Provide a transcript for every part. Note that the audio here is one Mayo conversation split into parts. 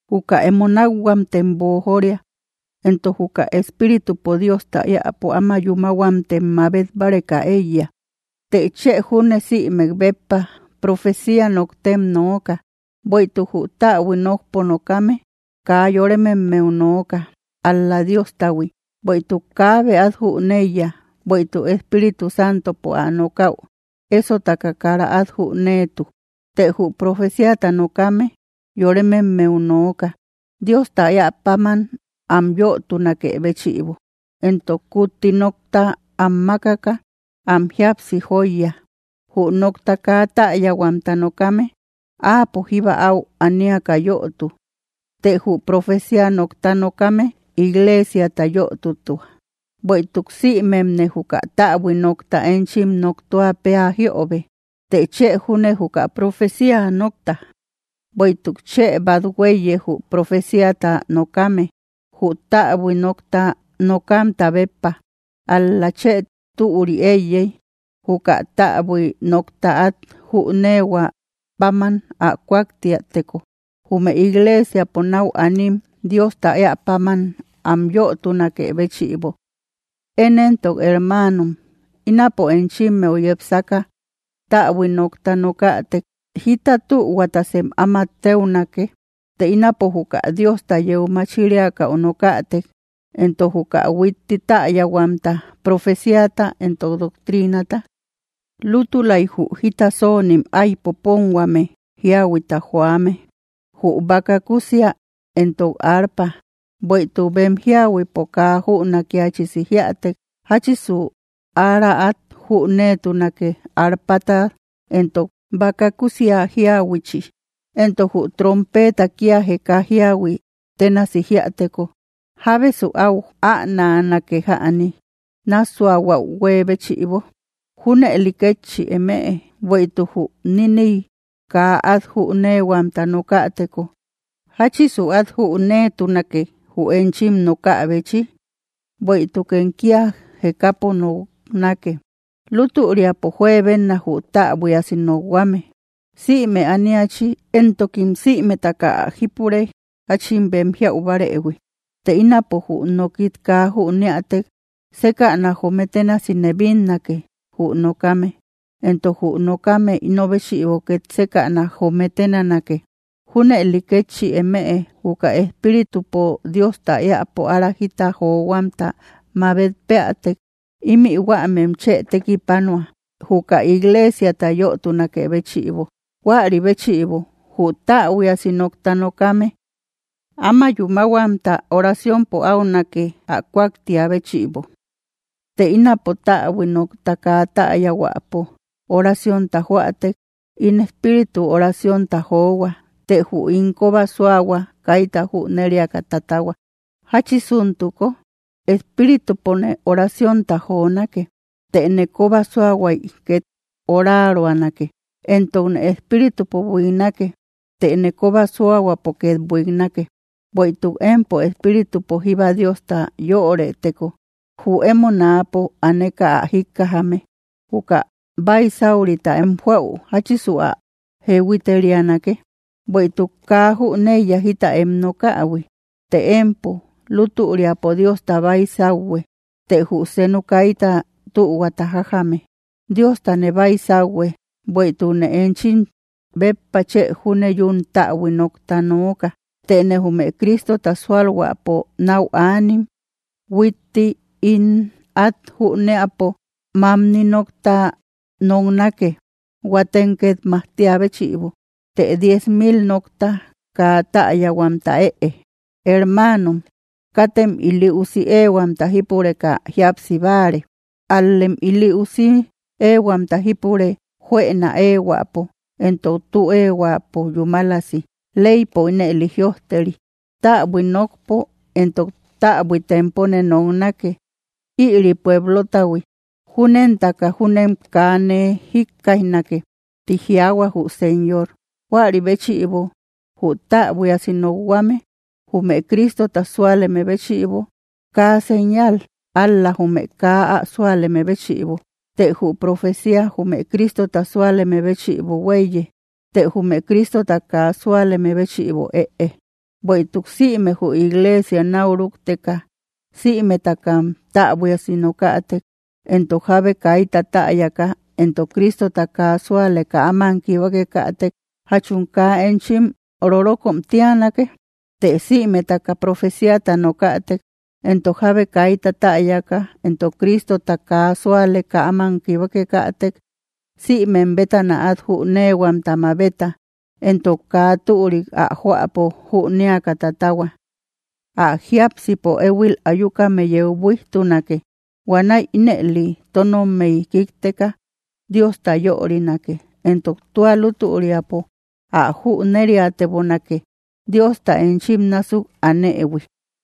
Juka emo nakhuamtem boojoria; entok juka Espíritupo Diosta eäpo áma yúmahuamtem mabet báareka eíya, të chë junne sïmek béppa profecia noktem noóka. Bueïtuk jü täbui nokpo nokame kaa yorememmeu nooka; ál‑la Diostahui, bueïtuk kaabe at jüneiya, bueïtuk Espíritu Santopo ä nokaü esotaka kara at jünetu. Të jü profeciata nokame yorememmeu nooka, Diosta eäpaman am yötunakë béchïbo, entok kutti nokta am makaka, am jíapsi joiya. Jü nokta kaa täyahuamta nokame, áapo jíba au aniaka yötu, të jü profecia nokta nokame, iglesiata yötutua. Bueïtuk sïmemne juka täbui nokta enchim noktua peä jiöbe, të chë junne juka profecia nokta, bueïtuk chë bat huéiye jü profeciata nokame, jü täbui nokta nokamta béppa, ál‑la chë türi eíyey juka täbui nokta at jünehuä paman ä kuaktïateko, jume iglesiapo nau anim Diosta eäpaman am yötunakë béchïbo. Én entok hermanom, ínapo enchimmeu yepsaka täbui nokta nokätek, ¿jita tühuatasem áma teunake, të ínapo juka Diosta yeu machiriakäu nokätek, entok juka huitti täyahuamta, profeciata, entok doctrinata? Lútulay jü jita sonim ái popönhuame jiahuita joame, jü baka kusia entok arpa, bueïtuk bem jiahuipo kaa jünakiachisis jíätek, ¿jachisu ára at jüneetunake arpata entok baka kusia jiahuichi? Entok jü trompeta kia jeka jiahui tenasi jiäteko, ¿jábesu au änanake jäni, nassuahuäu huee béchïbo? Junëli kétchi emëe, bueïtuk jü niniy kaa at jünehuamta nokäteko, ¿jachisu at jüneetunake jü enchim nokäbechi? Bueïtukem kia jekapo noknake. Lutüriapo juebena jü täbuiasi nokhuame sïme ániachi, entokim sïmetaka ä jípure jachin bem jiau barëhui. Të ínapo jü nokit kaa jüniatek, sekäna joome bénasi nee bínnake jü nokame, entok jü nokame ino béchïbo ket sekäna joome ténanake. Junëli ketchí emëe; juka Espíritupo Diosta eapo ära jita johuamta mabet peatek, ímï huämem chë tekipanua, juka iglesiata yötunakë béchïbo. Huäri béchïbo jü täbuiasi nokta nokame, áma yúmahuamta oraciompo aunake ä kuaktia béchïbo. Të ínapo täbui nokta kaa täyahuäpo oraciónta joatek, ín espíritu oraciónta johua, të jü ín koba suahua kayta jüneriaka tatahua. ¿Jachisuntuko? Espíritupone oraciónta jonake, tëne koba suahuay ket oraruanake, entokne espíritupo buiknake, tëne koba suahuapo ket buiknake. Bueïtuk empo espíritupo jíba Diosta yöreteko, jü emo náapo aaneka ä jikkajame: ¿juka baisaurita em joau jachisu ä jehuiterianake? Bueïtuk kaa jüneiya jita em nokähui. Të empo, lutüriapo Diosta baysauhue; të jü seenu kayta tühuata jajjame. Diostane baysauhue bueïtukne enchim béppa chë júne yún täbui nokta nooka; tëne jume Cristota sualhuäpo nau anim, huitti ín at jünëapo mamni nokta noknake, huatem ket majtia béchïbo, të diez mil nokta kaa täyahuamta ëe. Hermanom, katem ili usi éehuamta jípureka jíapsi báare, al‑lem ili usi ehuamta jípure juëna ehuäpo, entok tü ehuäpo yúmalasi. Leypo ínëli jïojteri: “Täbui nokpo entok täbui tempone noknake ïri pueblotahui; júnentaka júnem kaa nee jikkaijnake, tï jiaahua jü Señor.” Juäri béchïbo jü täbuiasi nokhuame, jume Cristota súaleme béchïbo kaa señal, ál‑la jume kaa ä súaleme béchïbo; të jü profecia, jume Cristota súaleme béchïbo huéiye, të jume Cristota kaa súaleme béchïbo ëe. Bueïtuk, sïme jü iglesia nau rukteka sïmetakam täbuiasi nokätek, entok jábe kayta täyaka entok Cristota kaa sualeka áman kibakekätek, ¿jachum kaa enchim rorokom tianake? Të sïmetaka profeciata nokätek, entok jábe kayta täyaka entok Cristota kaa sualeka aman kibakekätek, sïmem bétana at jünehuamta mabeta, entok kaa türik ä joäpo jünéaka tatahua. Ä jiápsipo ehuil ayukame yeu buijtunake; huanäi ínëli tonommey kikteka Diosta yörinake, entok tua lutüriapo ä jüneriatebonake Diosta enchim násuk anëhui.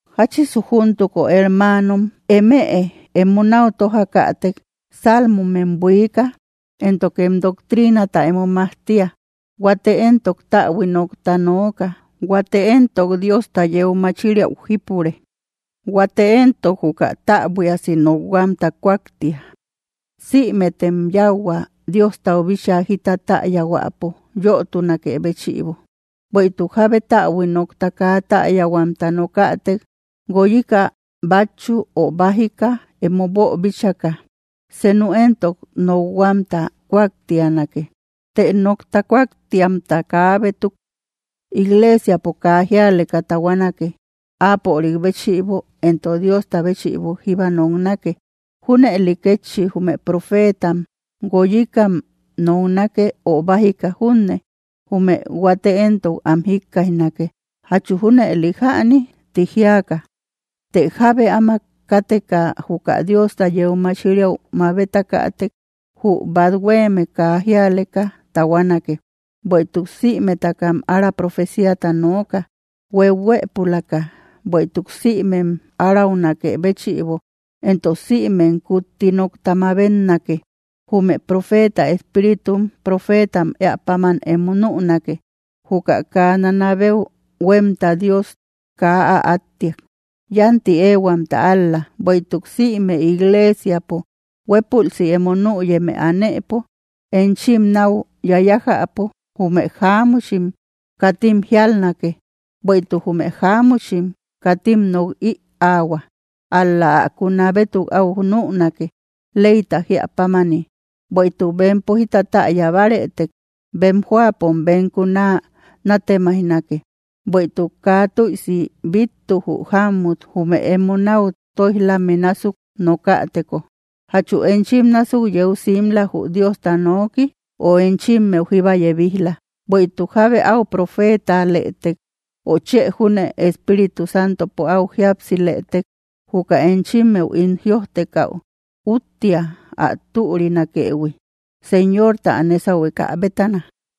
¿Jachisu júntuko hermanom? Emëe emo nau tojakätek, salmomem buika éntokem doctrinata emo majtia, huate entok täbui nokta nooka, huate entok Diosta yeu machiriau jípure, huate entok juka täbuiasi nokhuamta kuaktia, sïmetem yauhua Diostau bíchaa jita täyahuäpo yotunä béchïbo. Bueïtuk jábe täbui nokta kaa täyahuamta nokätek, gúoyíka batchu ö bájika emo boobíchaka, senu entok nokhuamta kuaktianake. Të nokta kuaktiamta kabétuk, iglesiapo kaa jíaleka tahuanake, áapörik béchïbo entok Diosta béchïbo jíba noknake. Juneli kétchi jume profetam gúoyíkam noknake ö bájika junne, jume huate entok am jikkaijnake: “¿Jachu junëli jäni?”, ti jiaka. Të jábe áma káteka juka Diosta yeu machiriau mabetakätek, jü bat hueme kaa jíaleka tahuanake. Bueïtuk sïmetakam ára profeciata nooka, hueuhuëpulaka, bueïtuk sïmem araunakë béchïbo entok sïmem kutti nokta mabetnake. Jume profeta espíritum, profetam eäpanim emo nünake. Juka kaa nanabeu huemta Dios kaa ä attiak. Yanti ehuamta ál‑la bueïtuk sïme iglesiapo huepulsi emo nüyeme aanëpo, enchim nau yayájäpo jume jáamuchim katim jialnake; bueïtuk jume jáamuchim katim nok‑ïahua, ál‑la ä kuna bétuk au nünake, leyta jía pámani. Bueïtuk bempo jita täyabaretek, bem joapom bem kuna natemaijnake; bueïtuk kaa tuïsi bittu jü jamut, jume emo nau toijlame násuk nokäteko. ¿Jachu enchim násuk yeu simbla jü Diosta noki, ö enchimmeu jíba yebijla? Bueïtuk jábe au profetalëtek, ö chë júne Espíritu Santopo áu jíapsilëtek, juka enchimmeu ín jïojtekau úttia ä türinakëhui Señorta ä nesahueka bétana.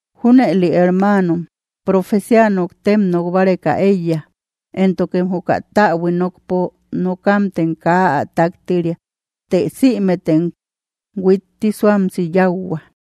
Junëli hermanom, profecia noktem nok báreka eiya, éntokem juka täbui nokpo nokamtem kaa ä taktiria; të sïmetem huitti suamsi yauhua.